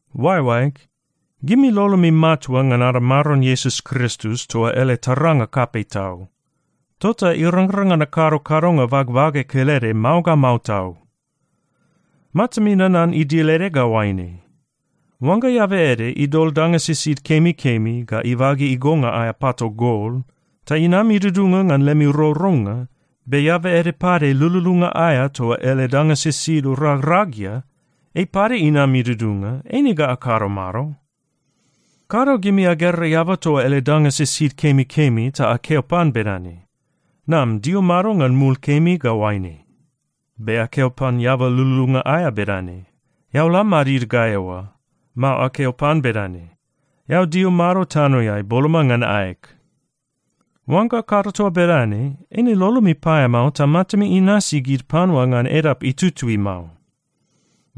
Oaeoaeg, gimi lolomi matua ngan ada Maron Iesus Kristus toa ele taranga kapei tau. Tota irangrang ngan akado kadonga bagbage kelede mao ga mao tau. Matami nanan idil ede ga oaine: Oangga eaba ede idol danga sisid kemikemi ga ibage igonga aea pato gol ta inam idudunga ngan lemi rourounga, be eaba ede pade lululunga aea toa ele danga sisid ragragia, ei pade inam idudunga, eine ga akado mado? Kado gimi agera eaba toa ele danga sisid kemikemi ta akeo pan bedane, “Nam dio mado ngan mul kemi ga oaine.” Be akeo pan eaba lululunga aea bedane, “Eao la madid ga eoa.” Mao akeo pan bedane, “Eao dio mado tanoeai, boloma ngan aeg.” Oangga akado toa bedane, eine lolomi paeamao ta matami inasi gid panua ngan edap itutui mao.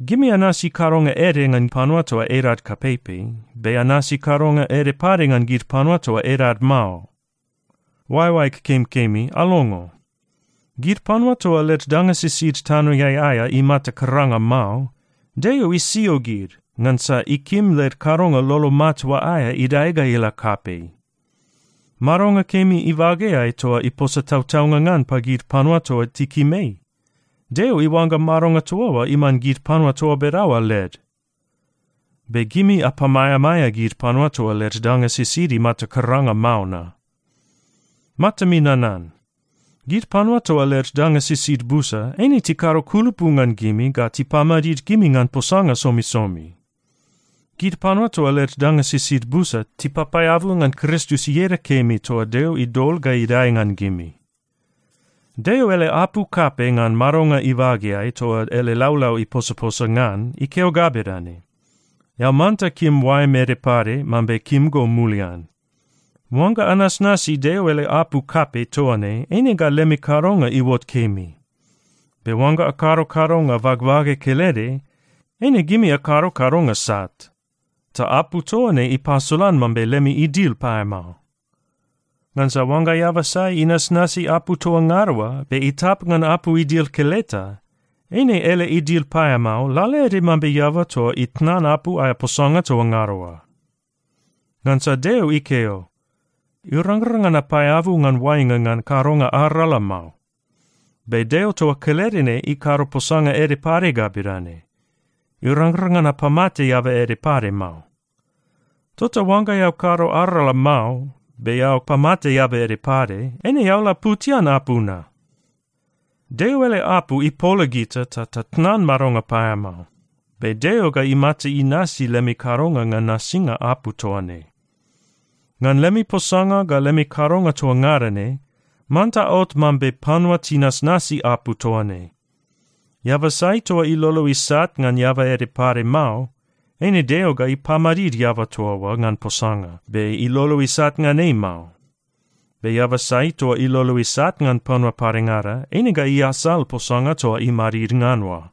Gimi anasi kadonga ede ngan panua toa edad kapeipei, be anasi kadonga ede pade ngan gid panua toa edad mao. Oaeoaeg kemikemi, alongo. Gid panua toa led danga sisid tanoeai aea imata karanga mao, Deo isio gid ngansa ikim led kadonga lolo matua aea idae ga ila kapei. Madonga kemi ibageai toa iposa tautaunga ngan pagid panua toa tikim ei, Deo iuangga madonga toa oa iman gid panua toa bedaoa led. Be gimi apamaeamaea gid panua toa led danga sisid imata karanga mao na. Matami nanan. Gid panua toa led danga sisid busa, eine tikado kulupu ngan gimi ga tipamadid gimi ngan posanga somisomi. Gid panua toa led danga sisid busa, tipapaeabu ngan Kristus ieda kemi toa Deo idol ga idae ngan gimi. Deo ele apu kapei ngan madonga ibageai toa ele laulau iposaposa ngan, ikeo ga bedane, “Eao manta kim oaem ede pade mambe kim go mulian.” Oangga anasnasi Deo ele apu kapei toa ne, eine ga lemi kadonga iuot kemi. Be oangga akado kadonga bagbage kelede, eine gimi akado kadonga sat, ta apu toa ne ipasolan mambe lemi idil paeamao. Ngansa oangga eaba sai inasnasi apu toa ngada oa, be itap ngan apu idil keleta, eine ele idil paeamao lalaede mambe eaba toa itnan apu aea posanga toa ngada oa. Ngansa Deo ikeo, “Irangrang ngan apaeabu ngan oainga ngan kadonga arala mao.” Be Deo toa kelede ne ikado posanga ede pade ga bedane, “Irangrang ngan apamate eaba ede pade mao.” Tota oangga eao kado arala mao, be eao pamate eaba ede pade, eine eao laputian apu na. Deo ele apu ipola gita ta tatnan madonga paeamao. Be Deo ga imata inasi lemi kadonga ngan nasinga apu toa ne. Ngan lemi posanga ga lemi kadonga toa ngada ne, manta aot mambe panua tinasnasi apu toa ne. Eaba sai toa ilolo isat ngan eaba ede pade mao, eine Deo ga ipamadid eaba toa oa ngan posanga, be ilolo isat ngan ei mao. Be eaba sai toa ilolo isat ngan panua padengada, eine ga iasal posanga toa imadid ngan oa.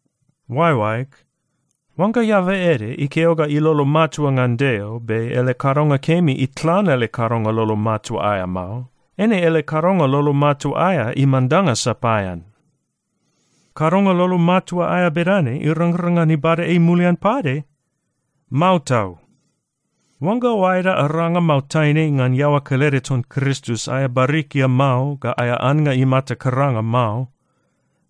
Oaeoaeg, oangga eaba ede ikeo ga ilolo matua ngan Deo, be ele kadonga kemi itlan ele kadonga lolo matua aea mao, eine ele kadonga lolo matua aea iman danga sapaean. Kadonga lolo matua aea bedane irangrang ngan ibada ei mulian pade? Mao tau! Oangga oaeda aranga mao taine ngan iaoa kelede ton Kristus aea barikia mao ga aea annga imata karanga mao,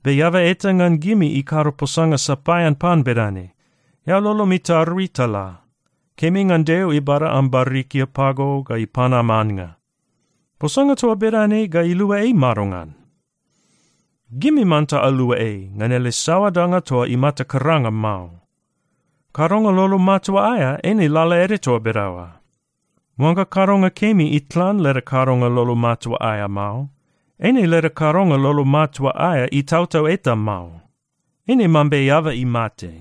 be eaba eta ngan gimi ikado posanga sapaean pan bedane, “Eao lolom itarui ta la. Kemi ngan Deo ibada am barikia pago ga ipan am annga,” posanga toa bedane ga ilua ei madongan? Gimi manta alua ei ngan ele saoa danga toa imata karanga mao. Kadonga lolo matua aea eine lalaede toa bedaoa. Oangga kadonga kemi itlan leda kadonga lolo matua aea mao, eine leda kadonga lolo matua aea itautau eta mao. Eine mambe eaba imate.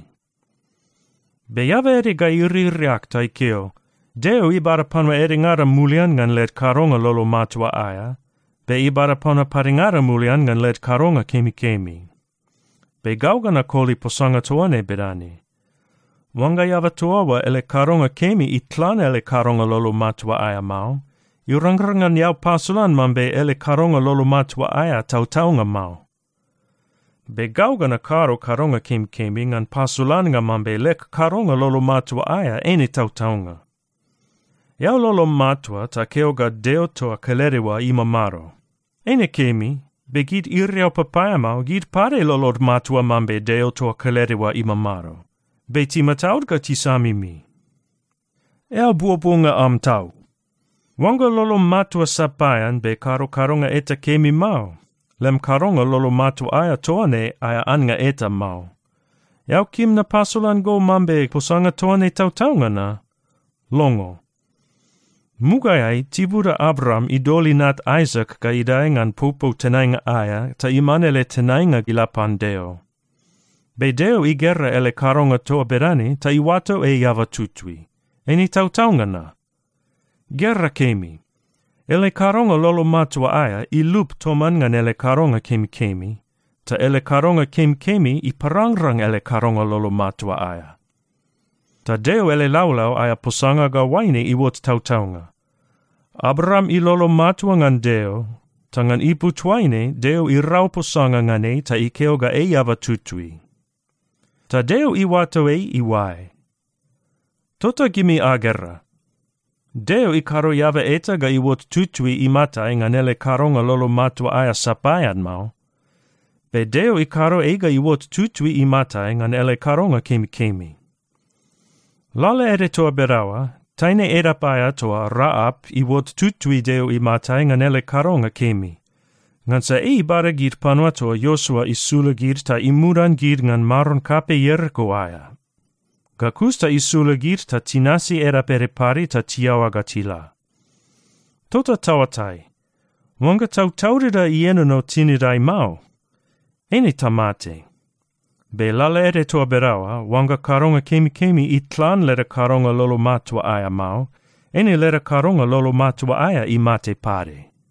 Be eaba ede ga iririak ta ikeo, “Deo ibada panua edengada mulian ngan led kadonga lolo matua aea, be ibada panua padengada mulian ngan led kadonga kemikemi.” Be gau ga nakoli posanga toa ne bedane: Oangga eaba toa oa ele kadonga kemi itlan ele kadonga lolo matua aea mao, irangrang ngan eao pasolan mambe ele kadonga lolo matua aea tautaunga mao. Be gau ga nakado kadonga kemikemi ngan pasolannga mambe leg kadonga lolo matua aea eine tautaunga. Eao lolom matua ta keo ga Deo toa kelede oa imamado. Eine kemi, be gid iriau papaeamao, gid pade lolod matua mambe Deo toa kelede oa imamado, be timataud ga tisamimi. Eao buobuonga am tau! Oangga lolom matua sapaean be kado kadonga eta kemi mao, lem kadonga lolo matua aea toa ne aea annga eta mao. Eao kim napasolan go mambe posanga toa ne tautaunga na? Longo. Mugaeai tibuda Abraam idol inat Aisak ga idae ngan popou tenainga aea ta iman ele tenainga ila pan Deo. Be Deo igera ele kadonga toa bedane ta iuato ei eaba tutui. Eine tautaunga na? Gera kemi. Ele kadonga lolo matua aea ilup toman ngan ele kadonga kemikemi, ta ele kadonga kemikemi iparangrang ele kadonga lolo matua aea. Ta Deo ele laulau aea posanga ga oaine iuot tautaunga, “Abraam ilolo matua ngan Deo, ta ngan ipu toaine Deo irau posanga ngan ei ta ikeo ga ei eaba tutui.” Ta Deo iuato ei iuae. Tota gimi agera, Deo ikado eaba eta ga iuot tutui imatai ngan ele kadonga lolo matua aea sapaean mao. Be Deo ikado ei ga iuot tutui imatai ngan ele kadonga kemikemi. Lalaede toa bedaoa, taine edap aea toa Raap iuot tutui Deo imatai ngan ele kadonga kemi, ngansa ei ibada gid panua toa Iosua isula gid ta imudan gid ngan maron kapei Ieriko aea. Ga kus ta isula gid ta tinasi edap ede pade ta tiaoa ga tila. Tota taoatai, oangga tautaudida ienono tinidai mao, eine tamate. Be lalaede toa bedaoa, oangga kadonga kemikemi itlan leda kadonga lolo matua aea mao, eine leda kadonga lolo matua aea imate pade.